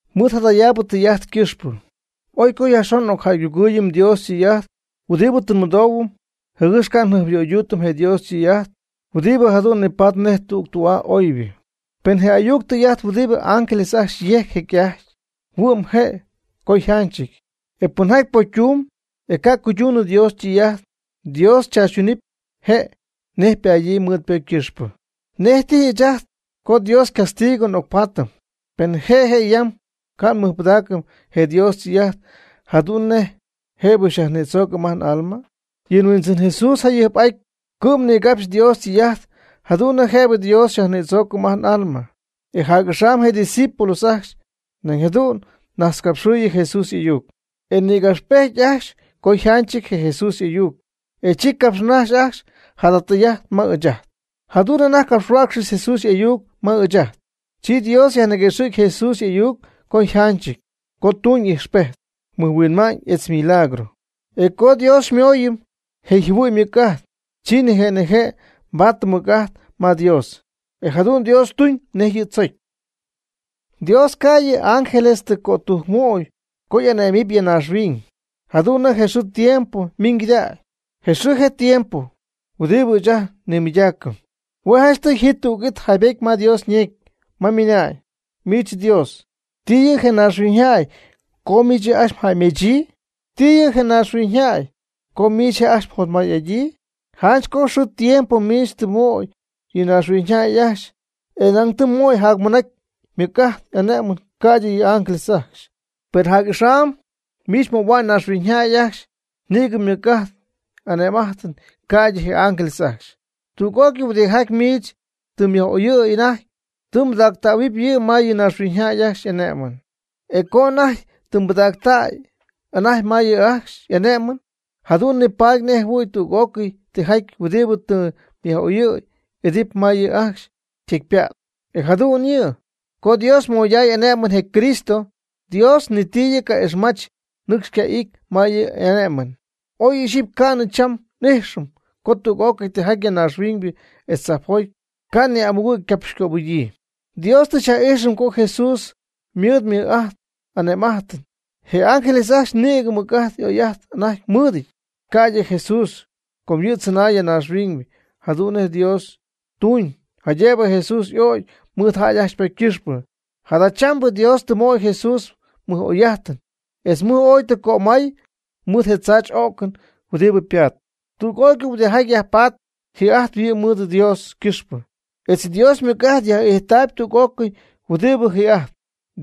Mɨɨd jadayaabɨ tɨy'ajt ycɨxpɨ, oy co yajxon n'ocjäygugɨɨyɨm Dios ytɨy'ajt huɨdibɨ tɨ nmɨdoohuɨm, jɨgɨx ca' njɨjpyöyduutɨm je Dios ytɨy'ajt huɨdibɨ jadu'n nipatp nej tü'aa oybɨ. Pen je ayuc tɨy'ajt huɨdibɨ ángeles ajcxy yejc jecy'ajty, huɨ'm je' co yjanchɨty. E pɨnjaty pocytumb, e ca' cuyduunɨ Dios ytɨy'ajt, Dios chaachytunɨpy je' nej padyii mɨɨd ypocy ycɨxpɨ. ¿Nej tijy ɨɨch ajt co Dios ycastigo nga'ocpaatɨm, pen je' je' yam ca' nmɨjpɨdaacɨm je Dios ytɨy'ajt jadu'n nej jëbɨ xyajnïdzoocɨm ajt n'alma? Yɨ Huindzɨn Jesús jayɨjp'aty cɨ'm nigapxy Dios ytɨy'ajt jadu'n nej jëbɨ Dios xyajnïdzoocɨm ajt n'alma. E jac'axam je discípulos ajcxy nañ jadu'n najtzcapxɨ̈y Jesús y'ayuc, e nïgapxpejty ajcxy co yjanchɨty je Jesús y'ayuc, e chi capxnajxy ajcxy jada tɨy'ajt ma ɨɨch ajt. Jadu'n anajty capxhuäcxcɨxy Jesús y'ayuc ma ɨɨch ajt, chi Dios yajniguëxɨ̈cp Jesús y'ayuc co yjanchɨty co tuñ ijxpejt, mɨjhuinma'ñ etz milagro. E co Dios xymooyɨm je yjɨhuɨ'ñ ymɨc'ajt, chi nije' nije' nbaatɨm mɨc'ajt ma Dios. E jadu'n Dios tuñ nej yɨ' tzocy. Dios ca' yɨ ángeles ajcxy ti cötujcɨn möy co y'ane'mɨty ya naaxhuiñ, jadu'n nej xɨɨ tiempo min cɨdägy, je xɨɨ je tiempo huɨdibɨ ɨɨch ajt nnimɨydaacɨm. Hue' janchtɨy ji tüg'it yjaybetyɨty ma Dios ñecy, ma ymɨna'ñ: Miich Dios, ¿ti yɨ' je naaxhuiñyjäy, co miich yɨ' ajcxy mjäymedzɨɨyb? ¿Ti yɨ' je naaxhuiñyjäy, co miich je' ajcxy mjotmay'adyii? Janch con xɨɨ tiempo miich tɨ mmöy yɨ naaxhuiñyjäy ajcxy e nañ tɨ mmöy jacmɨnacy ymɨc'ajt y'ane'm'ajt ca'ydɨ yɨ ángeles ajcxy. Per jac'axam miich mmöhua'ñ naaxhuiñyjäy ajcxy nïgɨ ymɨc'ajt y'ane'm'ajt, ca'ydɨ je ángeles ajcxy. Tüg'ócɨy huidɨjaty miich tɨ myaj'oyɨ̈y anajty tɨ mbɨdactähuɨp yɨ' ma yɨ naaxhuiñyjäy ajcxy ane'mɨn. E co anajty tɨ mbɨdactäy anajty ma yɨ' ajcxy y'ane'mɨn, jadu'n nipaady nej jɨhuɨ̈y tüg'ócɨy tijaty huɨdibɨ tɨ myaj'oyɨ̈y, y'idɨpy ma yɨ' ajcxy ytecypa't. E jadu'n yɨ', co Dios moyday ane'mɨn je Cristo. Dios ni ti yɨ' ca'ixmach nɨcxy yca'ity ma yɨ' y'ane'mɨn. Oy ixyipy ca'nɨ cham n'ijxɨm co tüg'ócɨy tijaty ya naaxhuiñ etz tzajpjoty ca'nɨ amugɨ' ycapxycöbɨgyii. Dios tɨ xyaj'ijxɨm co Jesús mɨɨd mɨj'ajt ane'm'ajt. Je ángeles ajcxy nïgɨ mɨc'ajt oy'ajt anajty mɨɨdɨty, ca'ydɨ Jesús co yɨ' chɨnay ya naaxhuiñ. Jadu'n Dios tuñ jaydëbɨ Jesús y'ögy mɨɨd jäy ajcxy ypocy ycɨxpɨ. Jadachambɨ Dios tɨ möy Jesús mɨj oy'ajtɨn, etz mɨj ooy tɨ cömay mɨɨd je tzaachy'o'cɨn huɨdibɨ ypaat. Tüg'ócɨy huɨdijaty ya yajpatp, ji'ajtp yɨ' mɨɨd Dios ycɨxpɨ etz Dios ymɨc'ajt yaj'ijtaayb tüg'ócɨy huɨdibɨ ji'ajtp.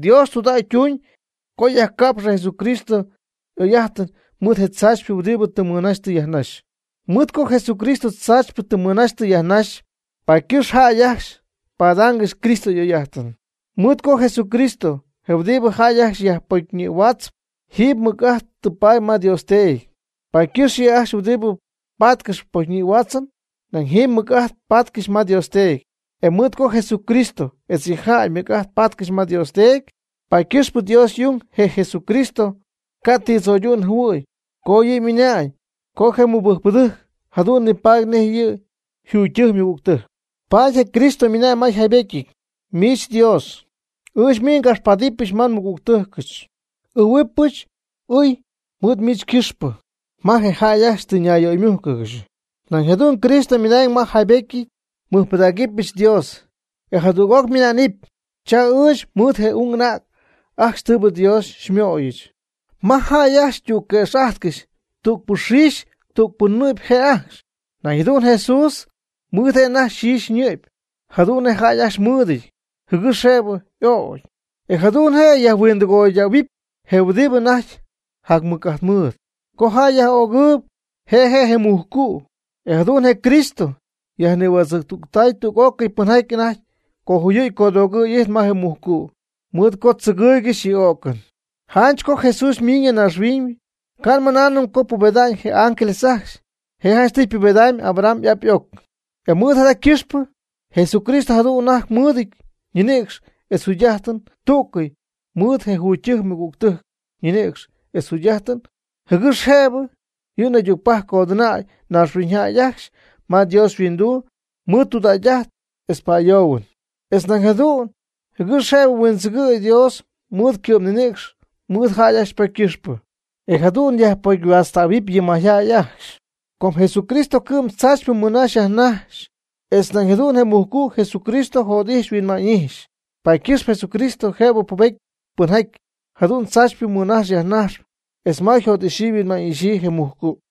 Dios tudägy ytuuñ co yajca'pxɨ Jesucristo y'oy'ajtɨn mɨɨd je tzaachypɨ huɨdibɨ tɨ mɨnaxy tɨ yajnaxy. Mɨɨd co Jesucristo tzaachypɨ tɨ mɨnaxy tɨ yajnaxy, paady ycɨxp jäy ajcxy padaangɨxy Cristo y'oy'ajtɨn. Mɨɨd co Jesucristo, je huɨdibɨ jäy ajcxy yajpocyñïhuaatzp, jiiby mɨc'ajt tɨ paady ma Dios Teedy, paady ycɨxp yɨ' ajcxy huɨdibɨ patcɨxp pocyñïhuaatzɨn nañ jɨm mɨc'ajt patcɨxy ma Dios Teedy. E mɨɨd co Jesucristo etz yɨ' yjäy mɨc'ajt patcɨxy ma Dios Teedy, paady ycɨxp Dios y'ung je Jesucristo ca' ti tzo'ydu'n jɨhuɨ̈y co yɨ' ymɨna'ñ co je mɨbɨjcpɨdɨjc jadu'n nipaady nej yɨ' yjugytɨjc ymɨgügtɨjc. Paady je Cristo ymɨna'ñ ma yjaybetyɨty: Miich Dios, ɨɨch miich ngapxpadɨpyɨch ma nmɨgügtɨjcɨch. N'ɨɨhuɨpyɨch ɨy mɨɨd miich ycɨxpɨ ma je jäy ajcxy tɨ nayyöymújcɨgɨxy. Nañ jadu'n Cristo ymɨna'ñ ma yjaybetyɨty: Nmɨjpɨdägɨbyɨch Dios. E jadüg'oc ymɨnaanɨp: Cha ɨɨch, mɨɨd je ung anäg ajcxy tɨɨbɨ Dios xymöyɨch. Ma jäy ajcxy ytügquëx'ajtcɨxy, tügpɨ yxiixy, tügpɨ nɨ'py je' ajcxy. Nañ jadu'n Jesús ymɨɨd je' anajty yxiixy ñɨ'py jadu'n nej jäy ajcxy ymɨɨdɨty jɨgɨx jëbɨ y'ögy, e jadu'n je' yajhuindɨgoydähuɨpy je huɨdibɨ anajty jamɨc'ajtmɨɨd co jäy yaj'ögɨɨyb, je' je' je mujcu'. E jadu'n je Cristo yajnihuädzɨ̈ctuty tüg'ócɨy pɨnjaty anajty cojuyɨ̈y codoogɨ̈y y'ijtp ma je mujcu', mɨɨd co tzɨgɨɨygɨxy yɨ y'o'cɨn. Janch co Jesús ymiiñ ya naaxhuiñ, ca' nmɨnaanɨm co pubeda'ñ je ángeles ajcxy, je' janchtɨy ypubedamyb Abraham y'ap y'oc. E mɨɨd jada ycɨxpɨ, Jesucristo jadu'n anajty mɨɨdɨty ñinïcx etz yjugy'ajtɨn tú'cɨy mɨɨd je jugytɨjc ymɨgügtɨjc ninïcx etz jugy'ajtɨn, jɨgɨx jëbɨ yɨ' naydügpajc codɨnäy naaxhuiñyjäy ajcxy ma Dios yhuinduu mɨɨd tudägy'ajt etz pa'ayoohuɨn. Etz nañ jadu'n jɨgɨx jëbɨ huindzɨgɨ̈y Dios mɨɨd ycɨ'm ñinïcx mɨɨd jäy ajcxy ypocy ycɨxpɨ, e jadu'n yajpocyhuaatztähuɨp yɨ mayjäy ajcxy. Com Jesucristo cɨ'm tzaachypɨ mɨnajx yajnajx, etz nañ jadu'n je mujcu' Jesucristo jot'ijxy huinma'ñ'ijxy, paady ycɨxp Jesucristo jëbɨ pubety pɨnjaty jadu'n tzaachypɨ mɨnajxp yajnajxp, etz ma yjot'ixyii yhuinma'ñ'ixyii je mujcu'.